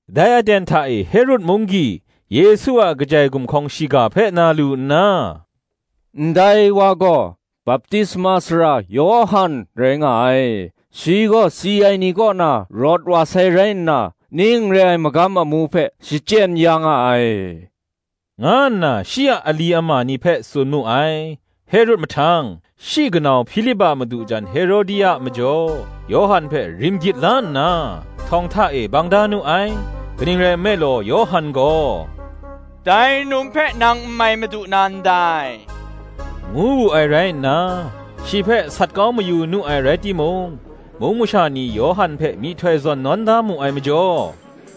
Dai aten hta e Herod munggyi Yesu a kajai gumhkawng shiga hpe na lu nna, “Ndai wa gaw Baptisma Sara Yawhan rai nga ai: shi gaw si ai ni kaw na rawt wa sai rai nna ning re ai magam amu hpe shachyen ya nga ai,” nga nna shi a ali ama ni hpe tsun mu ai. Herod mahtang, shi kanau Hpilip a madu jan Herodia majaw, Yawhan hpe rim gyit la nna, htawng hta e bang da nu ai. Kaning rai nme law, Yawhan gaw, “Dai num hpe nang n mai madu na ndai,” ngu wu ai rai nna, shi hpe sat kau mayu nu ai rai timung, mung masha ni Yawhan hpe myihtoi zawn nawn da mu ai majaw,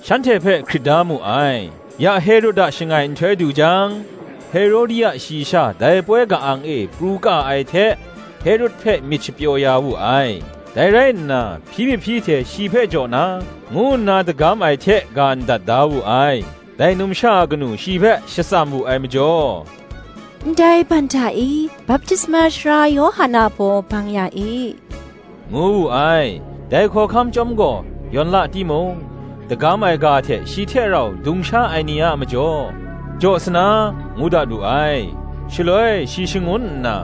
shanhte hpe hkrit da mu ai. Ya Herod a shangai nhtoi du jang, Herodia shayi sha dai poi ka-ang e pru ka ai hte Herod hpe myit shapyaw ya wu ai; dai rai nna, hpyi mahpyi hte shi hpe jaw na, ngu nna dagam ai hte ga ndat da wu ai. Dai numsha a kanu shi hpe shatsam wu ai majaw, “Ndai ban hta e, baptisma sara Yawhan a baw bang ya e,” ngu wu ai. Dai hkawhkam chyawm gaw, yawn la timung, dagam ai ga hte shi hte rau dung sha ai ni a majaw, jaw sa na, ngu dat wu ai: shaloi shi shangun nna,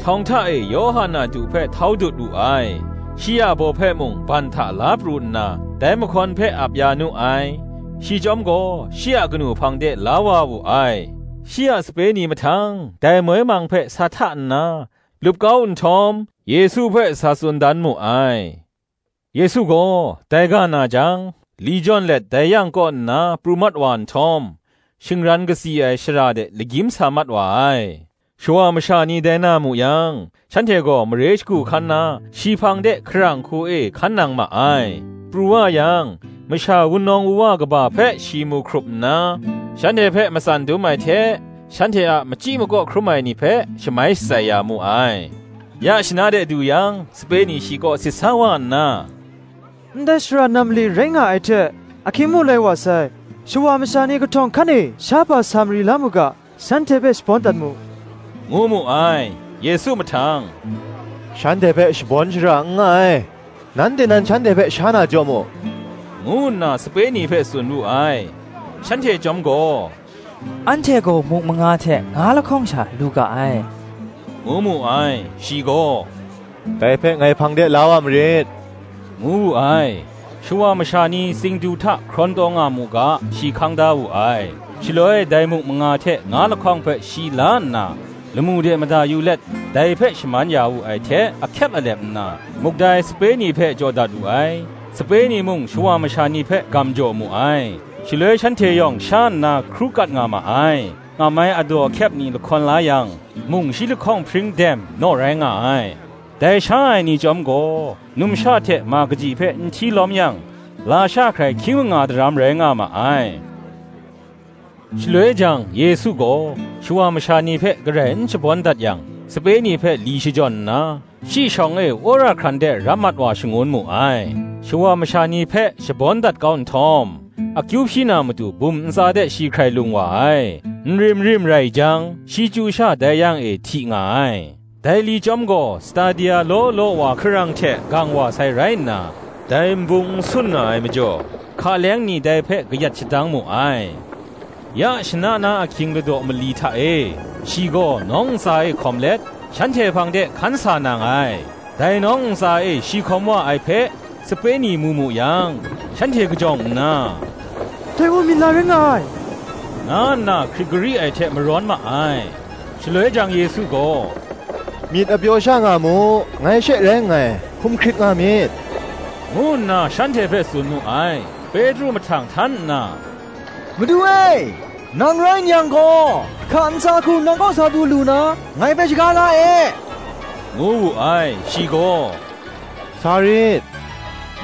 htawng hta e Yawhan a du hpe htau dut wu ai. Shi a baw hpe mung ban hta la pru nna, dai mahkawn hpe ap ya nu ai: shi chyawm gaw, shi a kanu hpang de la wa wu ai. Shi a sape ni mahtang dai moi mang hpe sa hta nna, lup kau nhtawm, Yesu hpe sa tsun dan mu ai. Yesu gaw, dai ga na jang, li jawn let dai yang kaw nna pru mat wa nhtawm, shingran katsi ai shara de lagyim sa mat wa ai: shawa masha ni dai na mu yang, shanhte gaw mare shagu hkan na shi hpang de hkarang hku e hkan nang ma ai. Pru wa yang, masha wunawng wuwa kaba hpe shi mu hkrup nna, shanhte hpe matsan dum ai hte shanhte a machyi makaw hkrum ai ni hpe shamai shatsai ya mu ai. Ya shana de du yang, sape ni shi kaw sit sa wa nna, “Ndai shara nam mali rai nga ai hte, ahkying mung lai wa sai: shawa masha ni kahtawng hkan e shahpa sa mari la mu ga, shanhte hpe shabawn dat mu,” ngu mu ai. Yesu mahtang, “shanhte hpe shabawn shara n nga ai; nanhte nan shanhte hpe sha na jaw mu,” ngu nna sape ni hpe tsun wu ai: Shanhte chyawm gaw, “Anhte gaw muk manga hte nga lahkawng sha, lu ga ai,” ngu mu ai. Shi gaw, “Dai hpe ngai hpang de la wa marit,” ngu wu ai. Shawa masha ni tsingdu hta hkrawn taw nga mu ga shi hkang da wu ai; shaloi dai muk manga hte nga lahkawng hpe shi la nna, lamu de mada yu let dai hpe shaman ya wu ai hte ahkyep alep nna, muk dai sape ni hpe jaw dat wu ai; sape ni mung shawa masha ni hpe gam jaw mu ai. Shaloi shanhte yawng sha nna hkru kat nga ma ai; ngam ai adaw ahkyep ni lahkawn la yang, mung shi lahkawng hpring dem naw rai nga ai. Dai sha ai ni chyawm gaw, numsha hte ma kaji hpe n hti lawm yang, lasha hkrai hkying manga daram rai nga ma ai. Shaloi jang, Yesu gaw, shawa masha ni hpe garai n shabawn dat yang, sape ni hpe li shajawn nna, shi shawng e wora hkran de rap mat wa shangun mu ai. Shawa masha ni hpe shabawn dat kau nhtawm, akyu hpyi na matu, bum ntsa de shi hkrai lung wa ai: nrim rim rai jang, shi chyu sha dai yang e hti nga ai. Dai li chyawm gaw, stadia law law wa hkarang hte gang wa sai rai nna, dai nbung n sun nga ai majaw, hka leng ni dai hpe kayat shadang mu ai, Ya shana na ahkying ladaw mali hta e, shi gaw nawng ntsa e hkawm let, shanhte hpang de hkan sa nang ai. Dai nawng ntsa e shi hkawm wa ai hpe, sape ni mu mu yang, shanhte kajawng nna, “Dai gaw minla rai nga ai,” nga nna hkrit gari ai hte marawn ma ai. Shaloi jang Yesu gaw, “Myit apyaw sha nga mu; ngai she rai nngai; hkum hkrit nga myit,” ngu nna shanhte hpe tsun mu ai. Petru mahtang htan nna, “Madu e, nang rai n yang gaw, hka ntsa hku nang kaw sa du lu na, ngai hpe shaga la e,” ngu wu ai: shi gaw, “Sa rit,”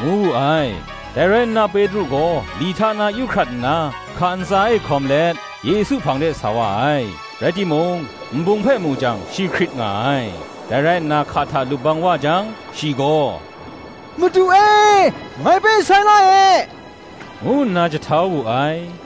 ngu wu ai. Dai rai nna Petru gaw li hta na yu hkrat nna, hka ntsa e hkawm let, Yesu hpang de sa wa ai. Rai timung, nbung hpe mu jang shi hkrit nga ai; dai rai nna hka hta lup bang wa jang, shi gaw, “Madu e, ngai hpe sai la e,” ngu nna jahtau wu ai.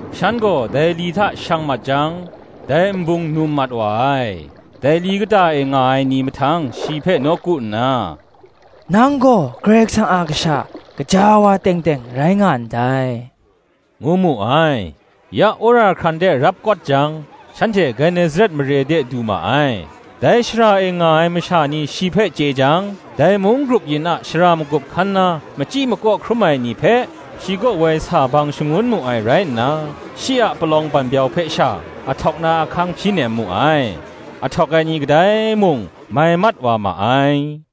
Shan gaw dai li hta shang mat jang, dai nbung num mat wa ai: dai li kata e nga ai ni mahtang shi hpe nawku nna, “Nang gaw Karai Kasang a Kasha gaja wa teng teng rai nga ndai,” ngu mu ai. Ya wora hkran de rap kawt jang, shanhte Genesaret mare de du ma ai. Dai shara e nga ai masha ni shi hpe chye jang, dai mung grup yin a shara magup hkan na machyi makaw hkrum ai ni hpe, shi kaw woi sa bang shangun mu ai rai nna, shi a palawng banbyau hpe sha ahtawk na ahkang hpyi nem mu ai: ahtawk ai ni kadai mung mai mat wa ma ai.